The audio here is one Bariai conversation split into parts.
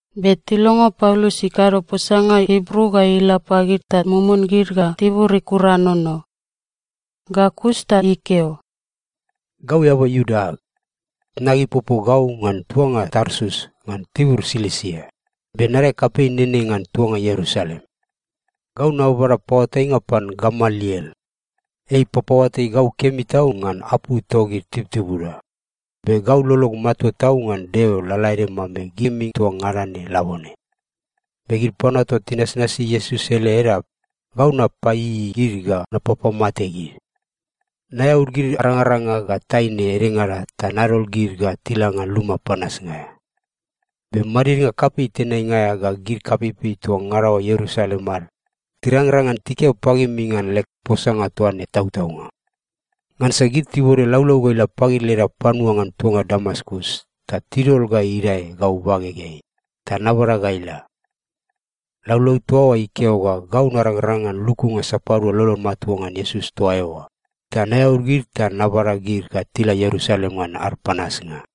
Be tilongo Paulus ikado posanga Ibru ga ila pagid ta mumun gid ga tibur ikuranono. Ga kus ta ikeo, “Gau eaba Iuda ag. Tnag ipopo gau ngan tuanga Tarsus ngan tibur Silisia, be nadae kapei nene ngan tuanga Ierusalem. Gau nababada paoatainga pan Gamaliel. Ei ipapaoatai gau kemi tau ngan apu togid tibutibuda, be gau lolog matua tau ngan Deo lalaede mambe gimi toa ngada ne labone. Be gid panua toa tinasnasi Iesus ele Edap, gau napaieiei gid ga napapamate gid. Naeaud gid arangaranga ga taine edengada ta nadol gid ga tila ngan luma panasnga aea. Be madidnga kapei tenainga aea ga gid kapeipei toa ngada oa Ierusalem ad tirangrang ngan tikeo pagimi ngan leg posanga toa ne tautaunga. Ngansa gid tibode laulau ga ila pagid leda panua ngan tuanga Damaskus ta tidol ga idae gau bagegeai, ta nabada ga ila. Laulau toa oa ikeo ga gau narangrang ngan lukunga sapadua lolod matua ngan Iesus toa eoa, ta naeaud gid ta nabada gid ga tila Ierusalem ngan ad panasnga.”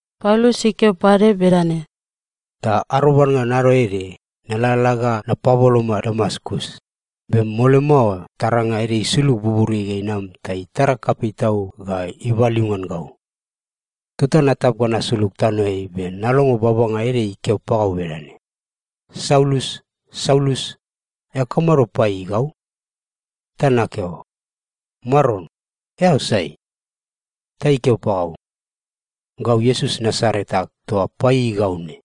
Paulus ikeo pade bedane, “Ta arobad ngan ado ede, nalalala ga napaboloma Damaskus, be mole mao taranga ede isulug buburiai ga inam ta itara kapei tau ga ibaliu ngan gau. Tota natap ga nasulug tanoeai be nalongo babanga ede ikeo pagau bedane, ‘Saulus, Saulus, eao kamado paieiei gau?’ “Ta nakeo, ‘Maron, eao sai?’ “Ta ikeo pagau, ‘Gau Iesus Nasaret ag toa paieiei gau ne.’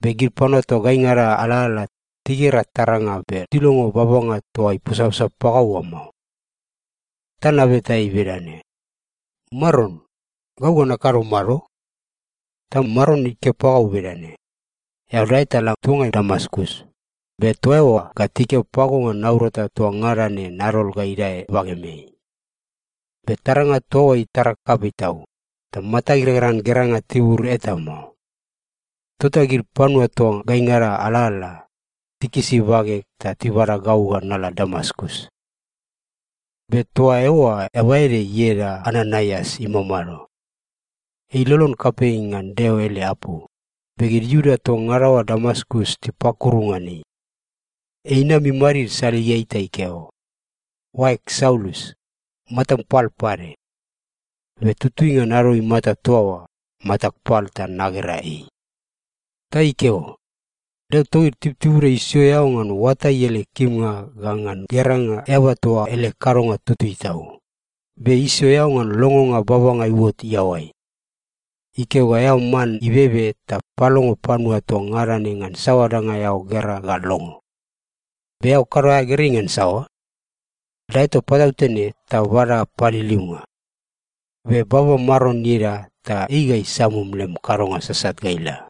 Be gid panua toa gaingada alalala, tigera taranga be tilongo babanga toa iposaposa pagau oa mao. “Ta nabeta ei bedane, ‘Maron, gau ga nakado mado?’ “Ta Maron ikeo pagau bedane, ‘Eao dae ta la tuangai Damaskus, be toa eoa ga tikeo pago ngan naurata toa ngada ne nadol ga idae bagemeai.’ Be taranga toa oa itara kapei tau, ta matag irangrang ngan geranga tibur eta mao. Tota gid panua toa gaingada alalala, tikisi bageg ta tibada gau ga nala Damaskus. “Be toa eoa eaba ede ieda Ananaias imamado. Ei ilolon kapei ngan Deo ele apu, be gid Iuda toa ngada oa Damaskus tipakuru ngan ei. Ei inam imadid saligeai ta ikeo, ‘Oaeg Saulus, matam pal pade.’ Be tutui ngan ado imata toa oa, matag pal ta nagera ei. “Ta ikeo, ‘Deo togid tibutibuda isio eao ngan oatai ele kimnga ga ngan geranga Eaba toa ele kadonga itutui tau, be isio eao ngan longonga babanga iuot iaoai. Ikeo ga eao man ibebe ta palongo panua toa ngada ne ngan saoa danga eao gera ga longo. Be eao kado aea gerei ngan saoa? Dae toa patautene ta bada paliliunga. Be baba Maron ieda ta ei ga isamum lem kadonga sasat ga ila.’”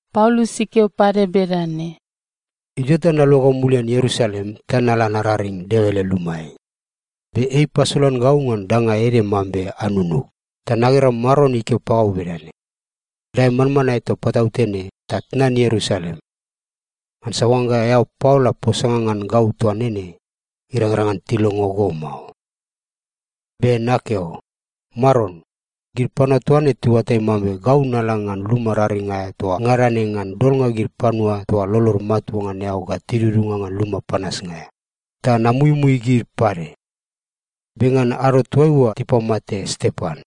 Paulus ikeo pade bedane, “Idio ta naluagau mulian Ierusalem ta nala nararing Deo ele lumaeai, be ei ipasolan gau ngan danga ede mambe anunug ta nagera Maron ikeo pagau bedane, ‘Dae manmanae toa patautene ta tnan Ierusalem. Ngansa oangga eao paola posanga ngan gau toa nene, irangrang ngan tilongo go mao.’ “Be nakeo, ‘Maron, gid panua toa ne tiuatai mambe gau nala ngan luma raring aea toa ngada ne ngan dolnga gid panua toa lolod matua ngan eao ga tidudunga ngan luma panasnga aea, ta namuimui gid pade. Be ngan ado toaiua tipamate Stepan,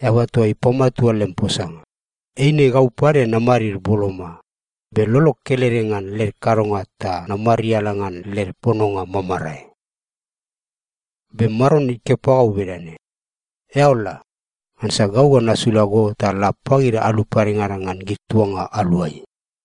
eaba toa ipamatua lem posanga, eine gau pade namadid boloma, be lolog kelede ngan led kadonga ta namariala ngan led pononga mamarae.’ “Be Maron ikeo pagau bedane, ‘Eao la! Ngansa gau ga nasula go ta la pagid alu padengada ngan gid tuanga aluai.’”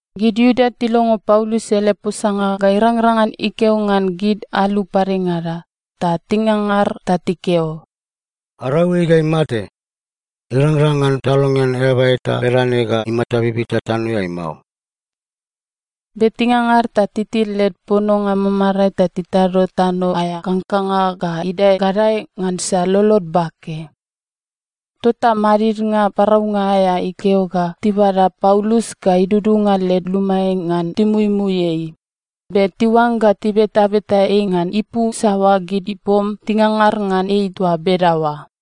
Gid Iuda tilongo Paulus ele posanga ga irangrang ngan ikeo ngan gid alu padengada, ta tingangar ta tikeo, “Arau ei ga imate! Irangrang ngan talongean eaba eta bedane ga imata bibita tanoeai mao!” Be tingangar ga titil led pononga mamarae ta titado tano aea kangkanga ga idae gadae ngansa lolod bake. Tota madidnga paraunga aea ikeo ga tibada Paulus ga idudunga led lumaeai ngan timuimui ei, be tiuangga tibetabeta ei ngan ipu saoa gid ipom tingangar ngan ei toa bedaoa.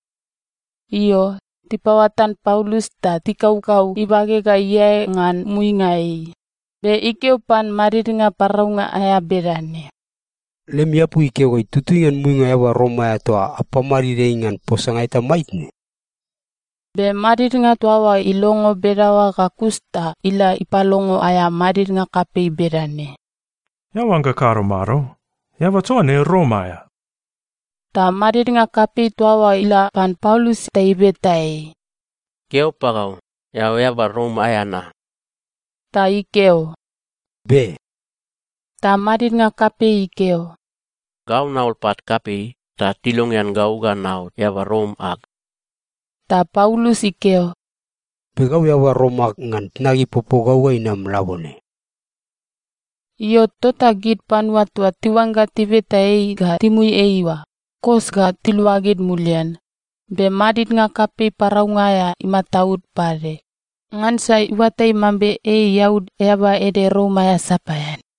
Io, tipaoatan Paulus ta tikaukau ibage ga iae ngan muinga ei, be ikeo pan madidnga paraunga aea bedane, “Lemi apu ikeo ga itutui ngan muinga eaba Rom aea toa apamadid ei ngan posanga eta maitne?” Be madidnga toa oa ilongo bedaoa ga kus ta ila ipalongo aea madidnga kapei bedane, “Eao oangga kado mado? Eaba toa ne Rom aea.” Ta madidnga kapei toa oa ila pan Paulus ta ibeta ei, “Keo pagau, eao eaba Rom aea na?” Ta ikeo, “Be.” Ta madidnga kapei ikeo, “Gau naol pat kapei, ta tilongean gau ga naot eaba Rom ag.” Ta Paulus ikeo, “Be gau eaba Rom ag ngan tnag ipopo gau ga inam labone.” Io, tota gid panua toa tiuangga tibeta ei ga timui ei oa, kos ga tiluagid mulian, be madidnga kapei paraunga aea imataud pade, ngansa iuatai mambe ei iaud eaba ede Rom aea sapaean.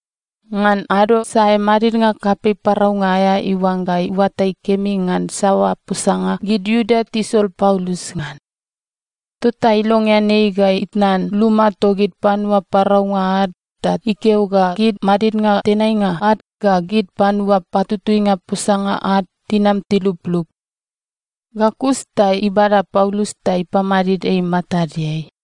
Ngan ado sae madidnga kapei paraunga aea iuangga iuatai kemi ngan saoa posanga gid Iuda tisol Paulus ngan. Tota ilongean ei ga itnan luma togid panua paraunga ad ta ikeo ga gid madidnga tenainga ad ga gid panua patutuinga posanga ad tinam tiluplup. Ga kus ta ibada Paulus ta ipamadid ei matadeai.